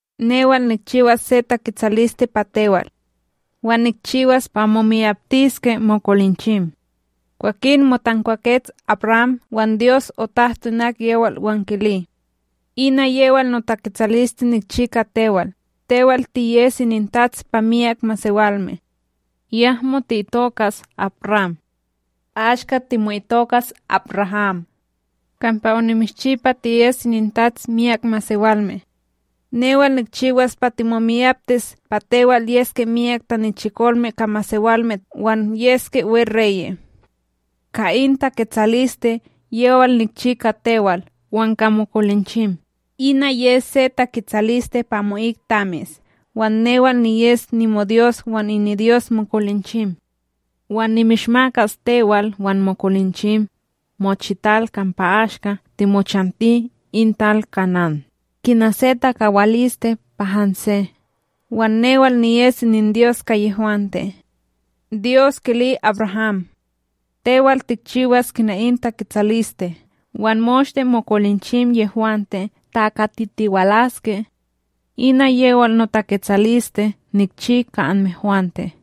Newal nikchiwas se taketsaliste pa tewal, wan nikchiwas pa momiyaptiske mokolinchim. Kwakin motankwakets AbRam wan Dyos otahto inak yewal wan kili: ―Ina yewal notaketsaliste nikchi ka tewal: Tewal tiyes inintats pa myak masewalme. Yahmo ti'itokas AbRam, ashka timo'itokas AbRaham, kampa onimishchi pa tiyes inintats myak masewalme. Newal nikchiwas pa timomiyaptis pa tewal yeske myak tanichikolme ka masewalme wan yeske WeReye'. Ka in taketsaliste yewal nikchi ka tewal wan ka mokolinchim, ina yes se taketsaliste pa amo'ik tamis. Wan newal niyes nimoDyos wan iniDyos mokolinchim. Wan nimishmakas tewal wan mokolinchim, mochital kampa ashka timochanti in tal Kanán, kina se takawaliste pa hanse, wan newal niyes ininDyos ka yehwante. Dyos kili AbRaham: ―Tewal, tikchiwas kina in taketsaliste, wan moshte mokolinchim yehwante takatitiwalaske. Ina yewal notaketsaliste nikchi ka anmehwante,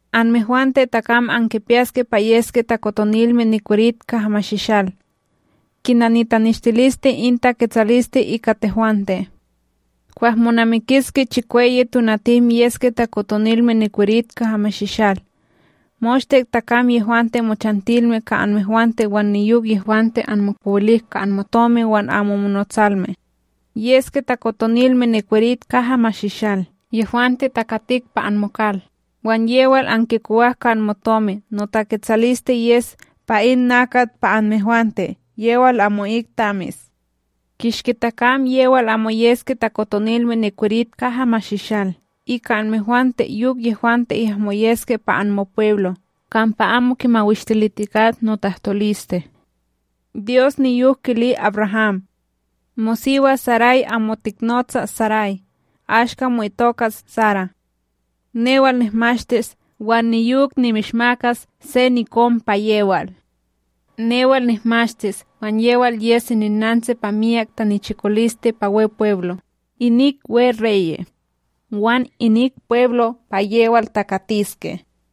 Anmehwante takam ankipiyaske pa yeske takotonilme nikwerit kaha mashishal, kina nitaneshtiliste in taketsaliste ika tehwante. Kwah monamikiske chikweyi tonatim, yeske takotonilme nikwerit kaha mashishal moshte takam yehwante mochantilme ka anmehwante, wan niyok yehwante anmokowilik ka anmotomi wan amo monotsalme. Yeske takotonilme nikwerit kaha mashishal yehwante takatik pa anmokal, wan yewal ankinkowak ka anmotomi, notaketsaliste yes pa in nakat pa anmehwante yewal amo'ik tamis. Kishki takam yewal amo yeske takotonilme nikwerit kaha mashishal, ika anmehwante yok yehwante yahmo yeske pa anmopweblo', kampa amo kimawishtilitikat notahtoliste. Dyos niyok kili AbRaham: ―Mosiwa Saray, amo tihnotsa Saray, ashka mo'itokas Sara. Newal nihmashtis, wan niyok nimishmakas se nikon pa yewal. Newal nihmashtis wan yewal yes ininnantsi pa myak tanichikoliste pa Wepweblo', inik WeReye' wan inik pweblo' pa yewal takatiske.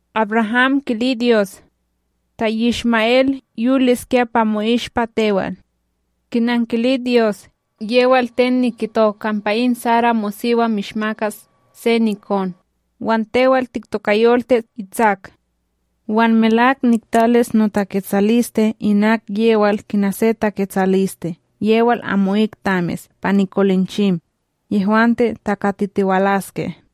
AbRaham kili Dyos: ―Ta Yishma'El yoliskya pa mo'ishpa tewal! Kinankili Dyos: ―Yewal ten nikito kampa in Sara mosiwa, mishmakas se nikon, wan tewal tiktokayoltis Itsak! Wan melak niktalis notaketsaliste inak yewal kina se taketsaliste yewal amo'ik tamis pa nikolinchim, yehwante takatitiwalaske.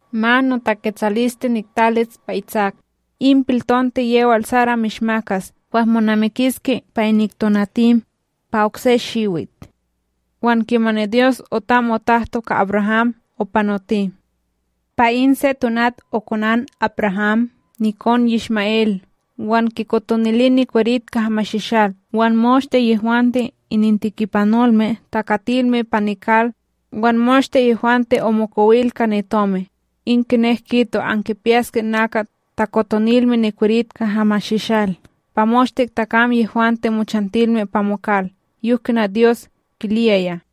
Ma notaketsaliste niktalis pa Itsak, in piltonte yewal Sara mishmakas kwah monamikiske pa inik tonatim, pa okse shiwit. Wan kimani Dyos otam otahto ka AbRaham, opanoti. Pa in se tonat okonan AbRaham nikon Yishma'El, wan kikotonili nikwerit kaha mashishal, wan moshte yehwante inintikipanolme takatilme pa nikal wan moshte yehwante omokowil ka nitomi; in kinek kito, ankipiyaske nakat takotonilme nikwerit kaha mashishal pa moshte takam yehwante mochantilme pa mokal, yok kina Dyos kiliyaya.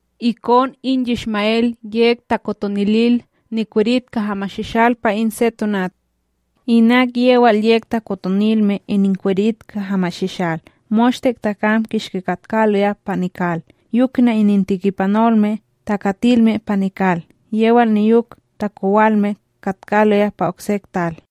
Ikon in Yishma'El yek takotonilil nikwerit kaha mashishal pa in se tonat inak yewal yek takotonilme ininkwerit kaha mashishal moshte takam kishki katkaloya pa nikal, yok kina inintikipanolme takatilme pa nikal yewal niyok takowalme katkaloya pa okse tal.